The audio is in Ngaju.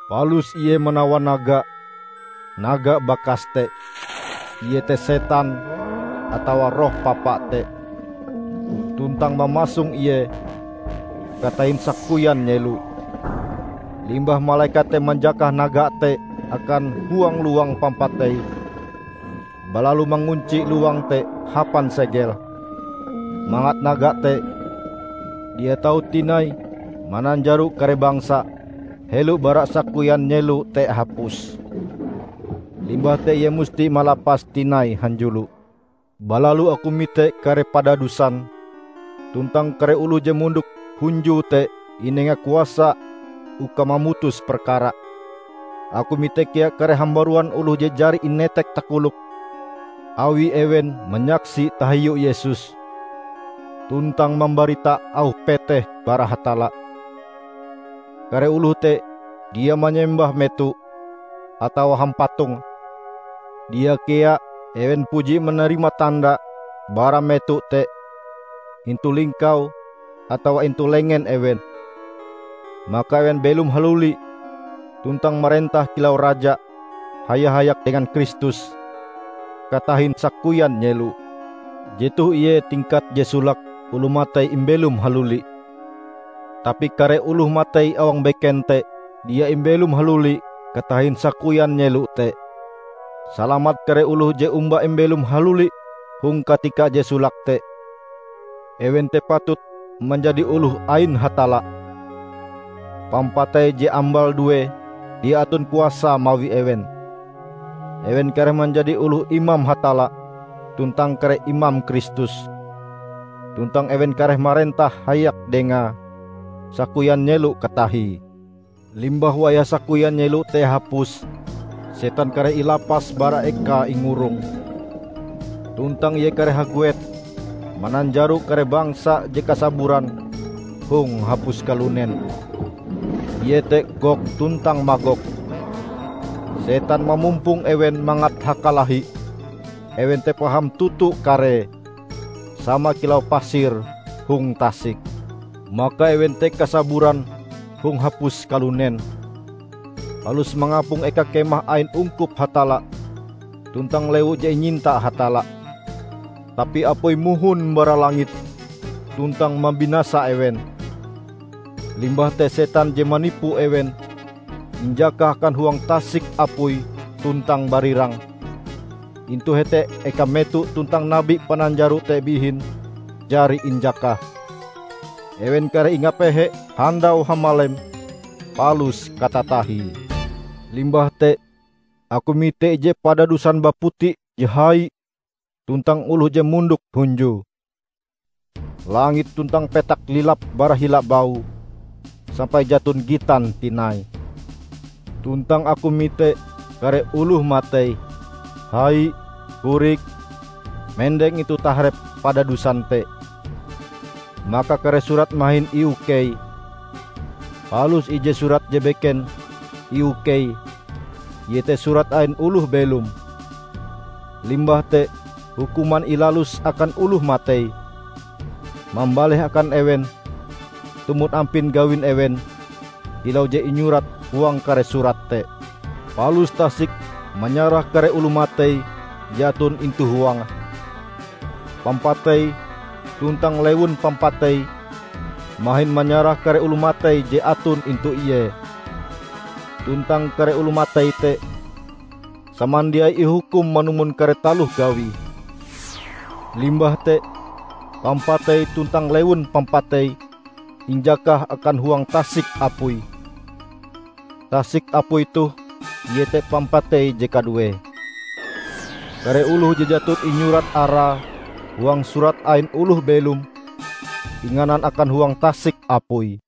Palus ie manawan naga, naga bakas te, -- iete setan atawa Roh Papa te -- tuntang mamasong ie katahin sakoyan nyelo. Limbah malekat te manjakah naga te akan huang lowang pampatei, balalu mangunci lowang te hapan segel mangat naga te dia tau tinai mananjaro kare bangsa helo bara sakoyan nyelo te hapus. Limbah te ie musti malapase tinai hanjulo. Balalu aku mite kare padadusan, tuntang kare oloh je mondok hunjue te inenga kuasa uka mamutus perkara. Aku mite kea kare hambaruan oloh je jari inetek takoloke awi ewen manyaksi tahiu Yesus, tuntang mambarita auh peteh bara Hatalla. Kare oloh te dia manyembah meto, atawa hampatonge. Dia kea ewen puji manarima tanda bara meto te intu lingkau atawa intu lengen ewen. Maka ewen belom haluli tuntang marentah kilau raja haya-hayak dengan Kristus katahin sakoyan nyelo. Jetoh ie tingkat je solake oloh matei imbelom haluli. (Tapi kare oloh matei awang beken te dia imbelom haluli katahin sakoyan nyelo te.) Salamat kare oloh je omba imbelom haluli hong katika je solake te. Ewen te patut manjadi oloh ain Hatalla. Pampatei je ambal due dia aton kuasae mawi ewen. Ewen kareh manjadi oloh imam Hatalla tuntang kare imam Kristus; tuntang ewen kareh marentah hayak Dengae sakoyan nyelo katahie. Limbah wayah sakoyan nyelo te hapus, setan kareh ilapas bara ekae ingurong, tuntang ie kareh haguet mananjaro kare bangsa je kasaburan hong hapus kalunen, iete Gog tuntang Magog. Setan mamumpong ewen mangat hakalahi, ewen te paham toto karee, sama kilau pasir hong tasik. Maka ewen te kasaburan hong hapus kalunen, palus mangapong eka kemah ain ungkup Hatalla tuntang lewu je inyinta Hatalla. Tapi apui mohon bara langit tuntang mambinasa ewen. Limbah te setan je manipu ewen, injakah akan huang tasik apui tuntang barirang. Intu hete eka meto tuntang nabi pananjaro te bihin jari injakah. Ewen kareh ingapehe handau hamalem palus katatahie. Limbah te aku mite ije padadusan baputi je hai tuntang oloh je mondok hunjue. Langit tuntang petak lilap bara hila baue, sampai jaton gitan tinai. Tuntang aku mite kare oloh matei, hai, korik, mendeng intu taharep padadusan te. Maka kare surat mahin iukei. Palus ije surat je beken iukei iete Surat ain Oloh Belom. Limbah te hukuman ilalus akan oloh matei, mambaleh akan ewen tumon ampin gawin ewen kilau je inyurat huang kare surat te. Palus tasik manyarah kare oloh matei je aton intu huange. Pampatei tuntang Lewun Pampatei mahin manyarah kare oloh matei je aton intu ie. Tuntang kare oloh matei te samandiai ihukum manumon kare taloh gawie. Limbah te Pampatei tuntang Lewun Pampatei injakah akan huang tasik apui. (Tasik apui toh iete pampatei je kaduee.) Kare oloh je jaton inyurat arae huang Surat ain Oloh Belom, inganan akan huang tasik apui.